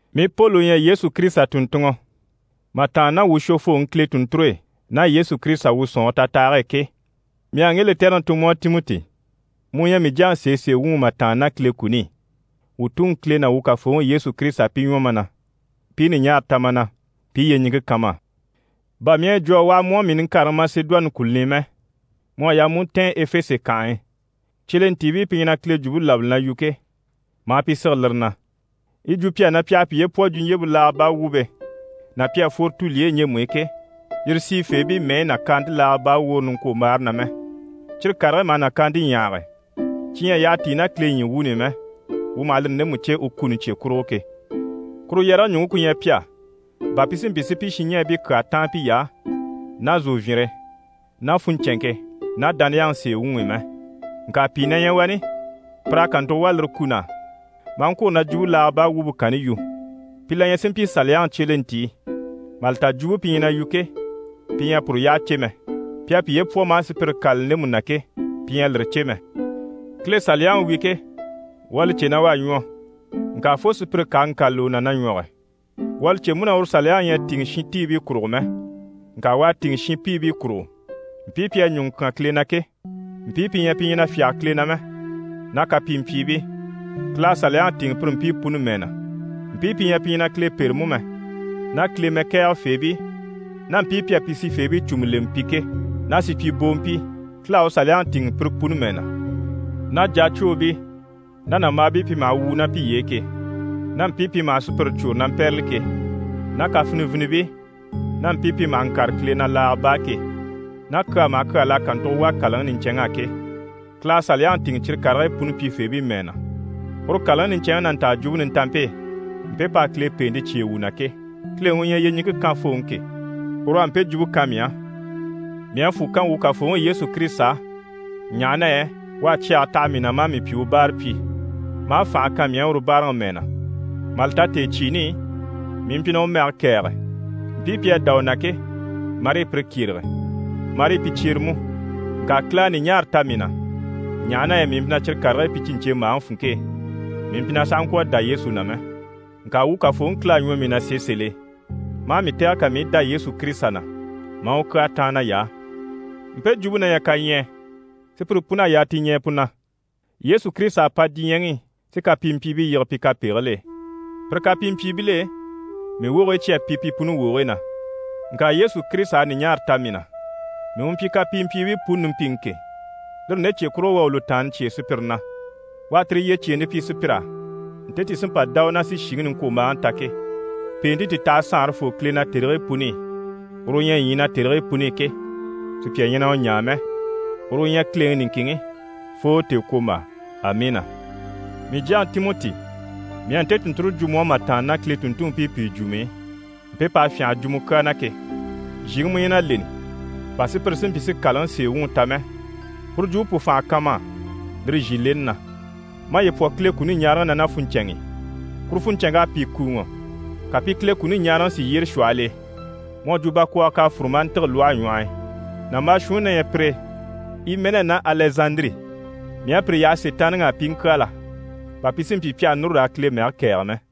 Mii Poli u ɲyɛ Yesu Kirisita tùnntunŋɔ mà tàanna ná wuu shwofooŋi Kile tùnnture e ná Yesu Kirisita, wuu sɔ̀nŋɔre tatahage e ke, mii u à ŋge lɛtɛrɛŋi tun mu á, Timɔti, mu u ɲyɛ mii jyaŋi sèesee wuŋi mà tàanna ná Kile kuni i. Wuu Tuŋi Kile ná wuu Kafooŋi Yesu Kirisita pi ɲwɔ ma na, pi i ɲùɲaara ta ma na, pi i yyeɲiŋke kan ma á. Bà mii à yi jwo a waha mu á, mii niŋkareŋi Masedoni kùluni i mɛ, mu à yaa mu u ntɛ̀ɛn Efese kànhe e, cyelentiibii pi ɲyɛ na Kile Jwumpe labali na yu ke, maa pi sige lire na. Yi jwo pi á na pi àha piye pwɔ jwuɲjyempe laaga baa wumpe ná pi à fworo tulyeyi ɲjemu i ke, yire sìifeebii mɛyi nàkaante laaga baa woore niŋkwombaare na mɛ. Cyire karigii maha nàkaante ɲyahage, cyi ɲyɛ a yyaha tíi ná Kile ɲyii wuuni i mɛ, wuu maha lire ndemu cè u kuni cye kurugo ke. Kuru yɛrɛge ɲùŋke ku ɲyɛ pi á, bà pi si mpyi si pi shinɲɛɛbii kyaa táan piy'á ná zòvyinre ná funɲcɛnŋke ná dániyaŋi sèe wuŋi i mɛ. Ŋka pìi na ɲyɛ wani, pir'à kàntugo wà lire kun'á, maa ŋkwôro na jwumpe laaga baa wumpe kanni yu. Pi la ɲyɛ si mpyi Kile Saliyaŋi cyelentii, mà li ta jwumpe pi ɲyɛ na yu ke, pi ɲyɛ a puru yyaha cè mɛ. Pi à piye pwɔ maa sùpyire kâlali ndemu na ke, pi ɲyɛ a lire cè mɛ. Kile Saliyaŋi wi ke, wuu à li cè na u à ɲwɔ, ŋka fo sùpyire ká a ŋkâlali u na na ɲwɔge. Wuu à li cè mú na uru Saliyaŋi ɲyɛ a tìŋɛ shintiibii kurugo mɛ, ŋka u à tìŋɛ shinpiibii kurugo. Mpii pi à ɲùŋɔ kyán Kile na ke, mpii pi ɲyɛ pi ɲyɛ na fyáge Kile na mɛ, ná kapimpyiibii, Kile à Saliyaŋi tìŋɛ pire mpii puni mɛɛ na. Mpii pi ɲyɛ pi ɲyɛ na Kile pêre mú mɛ, ná Kile mɛkɛɛgɛ feebii ná mpii pi à pi sifeebii cùmu lemɛ pi ke, ná supyiboompii, Kile à u Saliyaŋi tìŋɛ pire puni mɛɛ na, ná jacwoobii ná nàmbaabii pi maha wwùu ná piye e ke, ná mpii pi maha sùpyire cwôre na mpɛ́rɛli ke, ná kafinivinibii ná mpii pi maha ŋkâre Kile na laaga baa ke, ná kyaa maha kyaa l'à kàntugo wà kàlaŋi niɲcɛnŋ'á ke, Kile à Saliyaŋi tìŋɛ cyire karigii puni pyifeebii mɛɛ na. Uru kàlaŋi niɲcɛnŋi na nta Jwumpe Nintanmpe e, mpe p'à Kile pèente cyêe wuu na ke. Kileŋi u ɲyɛ yyeɲiŋke kanfooŋi ke, uru u à mpe jwumpe kan mii á. Mii à fwù kan wuu Kafooŋi Yesu Kirisita á, ɲaha na yɛ u à cyɛge taha mii na, maa mii pyi u báarapyi, maa fànha kan mii á uru báaraŋi mɛɛ na. Mà li ta tèecyiini i, mii mpyi na u mɛge kɛ̀ɛge, mpii pi à dá u na ke, marii pire kyérege, marii pi cyere mú. Ŋka Kile à ɲùɲaara ta mii na, ɲaha na yɛ mii mpyi na cyire karigii pyi cyi ɲcèmbaaŋi funŋke e, mii mpyi na sàha ŋkwɔ̀ a dá Yesu na mɛ. Ŋka wuu Kafooŋi Kile à ɲwɔ mii na sèe sèl'e, maa mii tɛ̀gɛ, ka mii i dá Yesu Kirisita na, maa u kyaa táan nay'á. Mpe jwumpe na ɲyɛ kaɲyɛɛ, sùpyire pun'à yaa ti ɲɛɛ pu na: Yesu Kirisita à pa diɲyɛŋi i si kapimpyiibii yige pi kapegigil'e. Pire kapimpyiibil'e, mii wogigii cyi à pi pi puni wogigii na. Ŋka Yesu Kirisita à ɲùɲaara ta mii na, mii u mpyi kapimpyiibii puni nimpiŋi ke, lire nde cye kurugo, u à u lùtaanni cyêe sùpyire na. U à tire yyecyeente pyi sùpyir'á, nte ti sí n‑pa dá u na si shìŋi niŋkwombaaŋi ta ke. Pèente ti taha saanrefoo Kile na tèrigii puni i, uru u ɲyɛ ɲyii na tèrigii puni i ke, sùpya ɲyɛ na u ɲaa mɛ; uru u ɲyɛ Kileŋi niŋkinŋi fo tèekwombaa. Amiina! Mii jyaŋi Timɔti, mii à nte tùnnture jwo mu á mà tàanna ná Kile tùnntunmpii pìi jwum'i, mpe p'à fyânha a jwo mu kyaa na ke. Zhìŋi mu ɲyɛ na leni bà sùpyire si mpyi si kàlaŋi sèe wuŋi ta mɛ, puru jwumpe pu fànha kan ma á lire zhìleni na. Maye pwɔ Kile kuni ɲaaraŋi na ná funɲcɛnŋ'i. Kuru funɲcɛnŋk'à pìi kùuŋɔ, ka pi Kile kuni ɲaaraŋi si yyére shwɔhɔl'e, mu à jwo bakwɔɔgɔ k'à fûru maa ntîge lwɔhe ɲwɔh'i. Nàmbaa shuunni na ɲyɛ pire e, Imɛnɛ ná Alɛzandiri, mii à pire yaha Sitaanniŋi á, pi i ŋkyaala, bà pi si mpyi pi àha núru raa Kile mɛge kɛ̀ɛge mɛ.